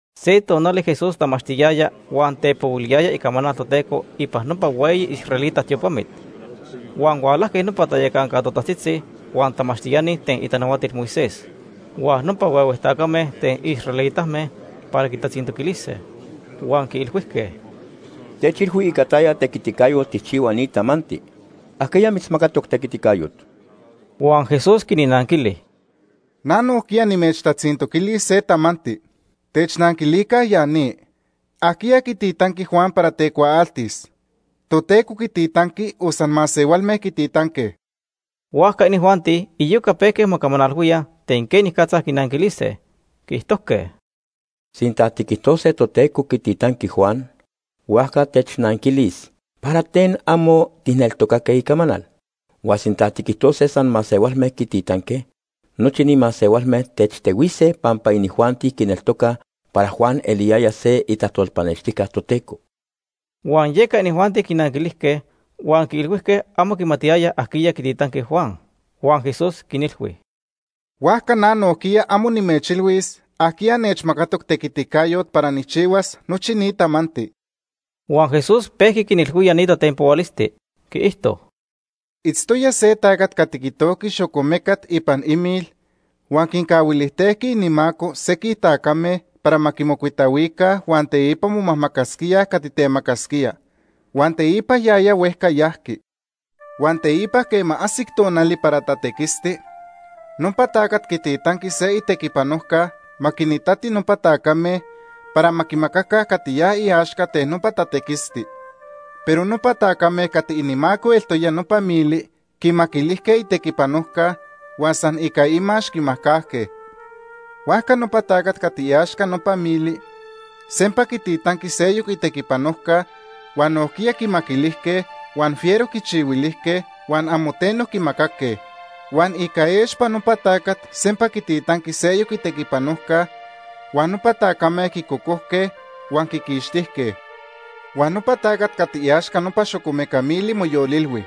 Se tonali Jesús tamachtiyaya huan tepohuiliyaya icamanal Toteco ipan nopa hueyi israelita tiopamit, huan hualajque nopa tayacanca totajtzitzi, huan tamachtiani ten itanahuatil Moisés, huan nopa huehue tacame ten israelitame para quitatzintoquilise. Huan quiilhuijque: ―Techilhui ica taya tequiticayot tijchihua ni tamanti. ¿Ajquiya mitzmacatoc tequiticayot? Huan Jesús quinnanquili: ―Na nojquiya nimechtatzintoquilis se tamanti. Technanquilica ya ni. ¿Ajquiya quititanqui Juan para tecuaaltis? ¿Toteco quititanqui o san masehualme quititanque? Huajca inijuanti iyoca pejque mocamanalhuíaj ten quenicatza quinanquilise. Quiijtojque: “Sinta tiquijtose Toteco quititanqui Juan, huajca technanquilis ¿para ten amo tijneltocaque icamanal? Huan sinta tiquijtose san masehualme quititanque, nochi ni masehualme techtehuise pampa inijuanti quineltocaj para Juan eliyaya se itajtolpanextijca Toteco.” Huan yeca inijuanti quinanquilijque, huan quiilhuijque amo quimatiyayaj ajquiya quititanqui Juan. Huan Jesús quinilhui: ―Huajca na nojquiya amo nimechilhuis ajquiya nechmacatoc tequiticayot para nijchihuas nochi ni tamanti. Huan Jesús pejqui quinilhuía ni tatenpohualisti, quiijto: “Itztoya se tacat cati quitojqui xocomecat ipan imil huan quincahuilijtejqui inimaco sequij tacame para ma quimocuitahuica huan teipa momajmacasquíaj cati temacasquía. Huan teipa yaya huejca yajqui. Huan teipa quema ajsic tonali para tatequisti, nopa tacat quititanqui se itequipanojca ma quinitati nopa tacame para ma quimacaca cati ya iaxca ten nopa tatequisti. Pero nopa tacame cati inimaco eltoya nopa mili quimaquilijque itequipanojca huan san ica imax quimajcajque. Huajca nopa tacat cati iaxca nopa mili sempa quititanqui seyoc itequipanojca, huan nojquiya quimaquilijque, huan fiero quichihuilijque, huan amo teno quimacaque. Huan ica expa nopa tacat sempa quititanqui seyoc itequipanojca, huan nopa tacame quicocojque, huan quiquixtijque. “Huan nopa tacat cati iaxca nopa xocomeca mili moyolilhui: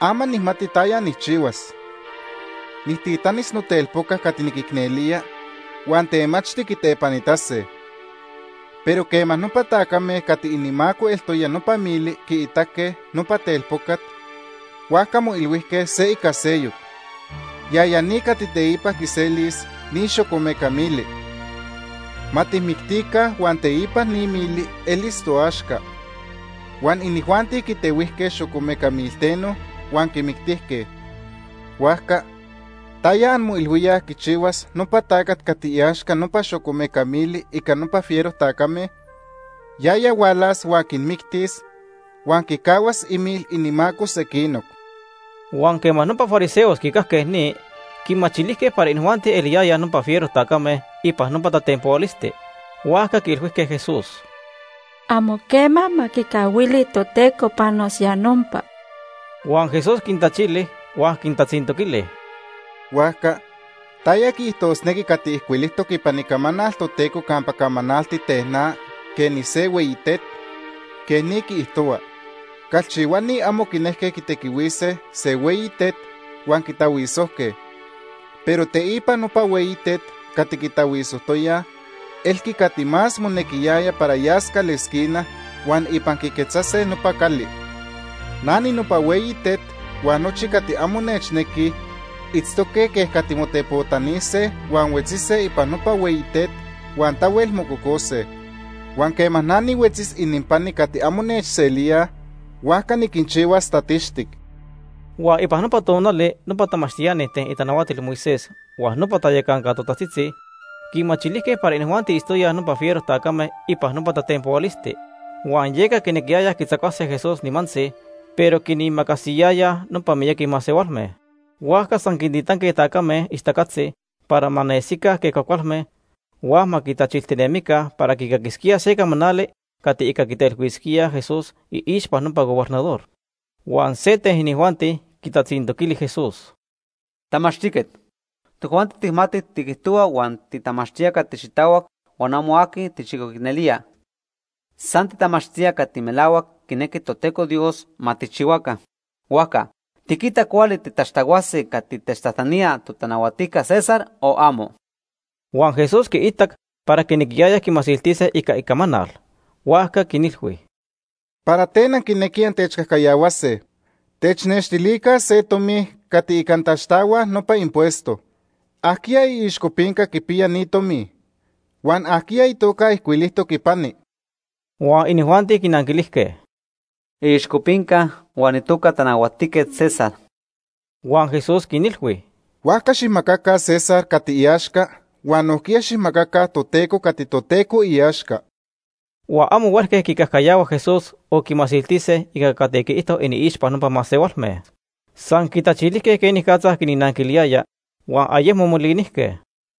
‘Ama nijmati taya nijchihuas. Nijtitanis notelpoca cati niquicnelía, huan temachti quitepanitase.’ Pero quema nopa tacame cati inimaco eltoya nopa mili quiitaque nopa telpocat, huajca moilhuijque se ica seyoc: ‘Yaya ni cati teipa quiselis ni xocomeca mili. Ma tijmictica huan teipa ni mili elis toaxca.’ Huan inijuanti quitehuijque xocomeca milteno huan quimictijque. “Huajca ¿taya anmoilhuíaj quichihuas nopa tacat cati iaxca nopa xocomeca mili ica nopa fiero tacame? Yaya hualas huan quinmictis huan quicahuas imil inimaco sequinoc.” Huan quema nopa fariseos quicajque ni, quimachilijque para inijuanti eliyayaj nopa fiero tacame ipan nopa tatenpohualisti, huajca quiilhuijque Jesús: ―¡Amo quema ma quicahuili Toteco panos ya nopa! Huan Jesús quintachili huan quintatzintoquili: ―Huajca ¿taya quiijtosnequi cati ijcuilijtoc ipan Icamanal Toteco campa camanalti ten na quej nise hueyi tet? Quej ni quiijtohua: ‘Calchihuani amo quinejque quitequihuise se hueyi tet, huan quitahuisojque. Pero teipa nopa hueyi tet cati quitahuisojtoyaj, elqui cati más monequiyaya para yas calesquina huan ipan quiquetzase nopa cali.’ Na ninopa hueyi tet huan nochi cati amo nechnequij itztoque quej cati motepotanise huan huetzise ipan nopa hueyi tet, huan tahuel mococose. Huan quema na nihuetzis ininpani cati amo nechselíaj, huajca niquinchihuas tatixtic. Huan ipan nopa tonali nopa tamachtiani ten itanahuatil Moisés huan nopa tayacanca totajtzitzi quimachilijque para inijuanti itztoyaj nopa fiero tacame ipan nopa tatenpohualisti. Huan yeca quinequiyayaj quitzacuase Jesús nimantzi, pero quinimacasiyayaj nopa miyaqui masehualme. Huajca san quintitanque tacame ixtacatzi para ma nesica quej cuajcualme huan ma quitachilijtinemica para quicaquisquíaj se camanali cati ica quitelhuisquíaj Jesús iixpa nopa gobernador. Huan se ten inijuanti quitatzintoquili Jesús: ―Tamachtijquet, tojuanti tijmatij tiquijtohua huan titamachtía cati xitahuac huan amo aqui tijchicoicnelía. San titamachtía cati melahuac quinequi Toteco Dios ma tijchihuaca. Huajca ¿tiquita cuali tiquixtahuase cati techtajtanía totanahuatijca César o amo? Huan Jesús quiitac para quinequiyayaj quimasiltise ica icamanal, huajca quinilhui: ―¿Para ten anquinequij antechcajcayahuase? Technextilica se tomi cati ica antaxtahuaj nopa impuesto. ¿Ajquiya iixcopinca quipiya ni tomi? Huan ¿ajquiya itoca ijcuilijtoc ipani? Huan inijuanti quinanquilijque: ―Iixcopinca huan itoca Tanahuatijquet César. Huan Jesús quinilhui: ―Huajca xijmacaca César cati iaxca huan nojquiya xijmacaca Toteco cati Toteco iaxca. Huan amo huelque quicajcayahua Jesús o quimasiltise ica cati quiijto iniixpa nopa masehualme. San quitachilijque quenicatza quinnanquiliyaya, huan ayecmo molinijque.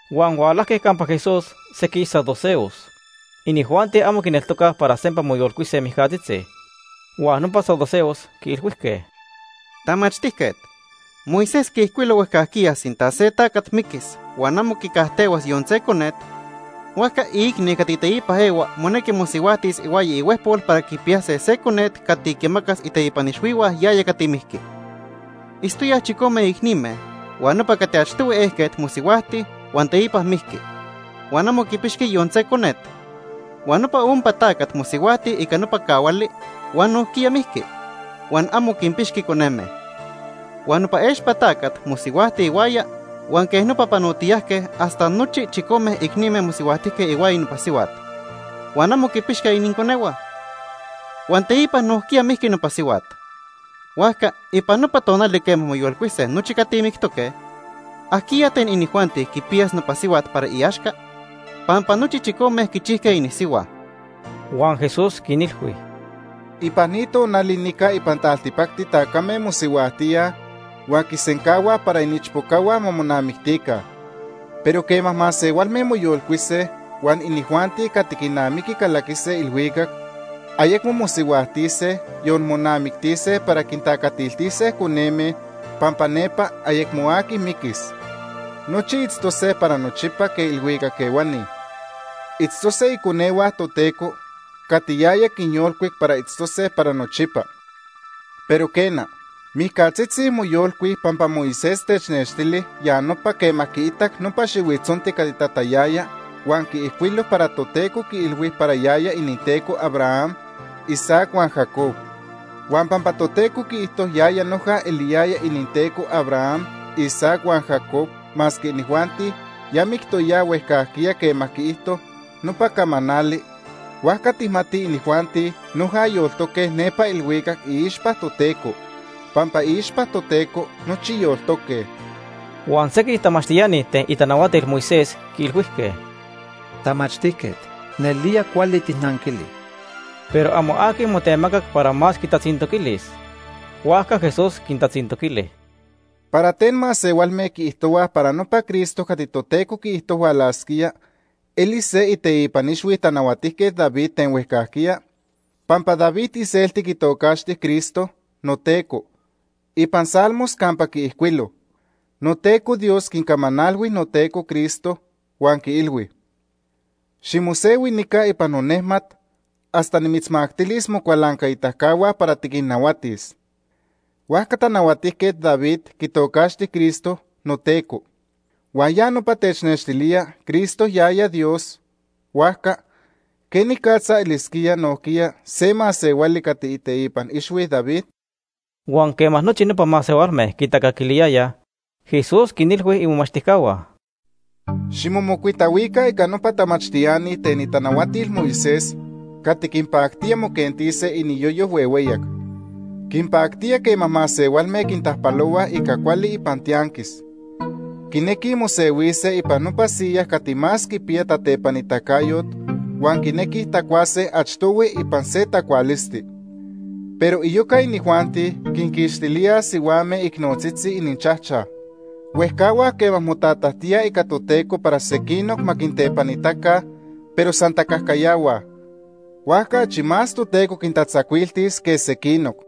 Huan hualajque campa Jesús sequij saduceos. Inijuanti amo quineltocaj para sempa moyolcuise mijcatzitzi. Huan nopa saduceos quiilhuijque: ―Tamachtijquet, Moisés quiijcuilo huejcajquiya sinta se tacat miquis huan amo quicajtehuas yon se conet, huajca iicni cati teipa ehua monequi mosihuajtis ihuaya ihuejpol para quipiyase se conet cati quimacas iteipan ixhuihua yaya cati mijqui. Itztoyaj chicome icnime huan nopa cati achtohui ejquet mosihuajti huan teipa mijqui, huan amo quipixqui yon se conet. Huan nopa ompa tacat mosihuajti ica nopa cahuali huan nojquiya mijqui, huan amo quinpixqui coneme. Huan nopa expa tacat mosihuajti ihuaya huan quej nopa panotiyajque hasta nochi chicome icnime mosihuajtijque ihuaya nopa sihuat, huan amo quipixque ininconehua. Huan teipa nojquiya mijqui nopa sihuat. Huajca ipan nopa tonali quema moyolcuise nochi cati mictoque, ¿ajquiya ten inijuanti quipiyas nopa sihuat para iaxca?, pampa nochi chicome quichijque inisihua. Huan Jesús quinilhui: ―Ipan ni tonali nica ipan taltipacti tacame mosihuajtíaj, huan quisencahuaj para iniichpocahua ma monamictica. Pero quema masehualme moyolcuise huan inijuanti cati quinamiqui calaquise ilhuicac, ayecmo mosihuajtise, yon monamictise para quintacatiltise coneme, pampa nepa ayecmo aqui miquis. Nochi itztose para nochipa quej ilhuicac ehuani. Itztose iconehua Toteco cati yaya quinyolcuic para itztose para nochipa. Pero quena, mijcatzitzi moyolcuij pampa Moisés technextili ya nopa quema quiitac nopa xihuitzonti cati tatayaya huan quiijcuilo para Toteco quiilhui para yaya ininTeco Abraham, Isaac huan Jacob. Huan pampa Toteco quiijto yaya noja eliyaya ininTeco Abraham, Isaac huan Jacob masque inijuanti ya mictoyaj huejcajquiya quema quiijto nopa camanali, huajca tijmatij inijuanti noja yoltoque nepa ilhuicac iixpa Toteco, pampa iixpa Toteco nochi yoltoque. Huan sequij tamachtiani ten itanahuatil Moisés quiilhuijque: ―Tamachtijquet, nelía cuali tijnanquili. Pero amo aqui motemacac para más quitatzintoquilis. Huajca Jesús quintatzintoquili: ―¿Para ten masehualme quiijtohuaj para nopa Cristo cati Toteco quiijto hualasquía elis se iteipan ixhui Tanahuatijquet David ten huejcajquiya? Pampa David iselti quitocaxti Cristo ‘noTeco’ ipan Salmos campa quiijcuilo: ‘Toteco Dios quicamanalhui noTeco Cristo huan quiilhui: Ximosehui nica ipan nonejmat, hasta nimitzmactilis mocualancaitacahua para tiquinnahuatis.’ Huajca Tanahuatijquet David quitocaxti Cristo ‘noTeco’ huan ya nopa technextilía Cristo yaya Dios, huajca ¿quenicatza elisquía nojquiya se masehuali cati iteipan ixhui David? Huan quema nochi nopa masehualme quitacaquiliyayaj, Jesús quinilhui imomachtijcahua: “Ximomocuitahuica ica nopa tamachtiani ten itanahuatil Moisés cati quinpactía moquentise iniyoyo huehueyac. Quinpactía quema masehualme quintajpalohuaj ica cuali ipan tianquis. Quinequij mosehuise ipan nopa siyas cati más quipiya tatepanitacayot huan quinequij tacuase achtohui ipan se tacualisti. Pero iyoca inijuanti quinquixtilíaj sihuame icnotzitzi ininchajchaj. Huejcahuaj quema motatajtíaj ica Toteco para sequinoc ma quintepanitaca, pero san tacajcayahuaj, huajca achi más Toteco quintatzacuiltis que sequinoc.”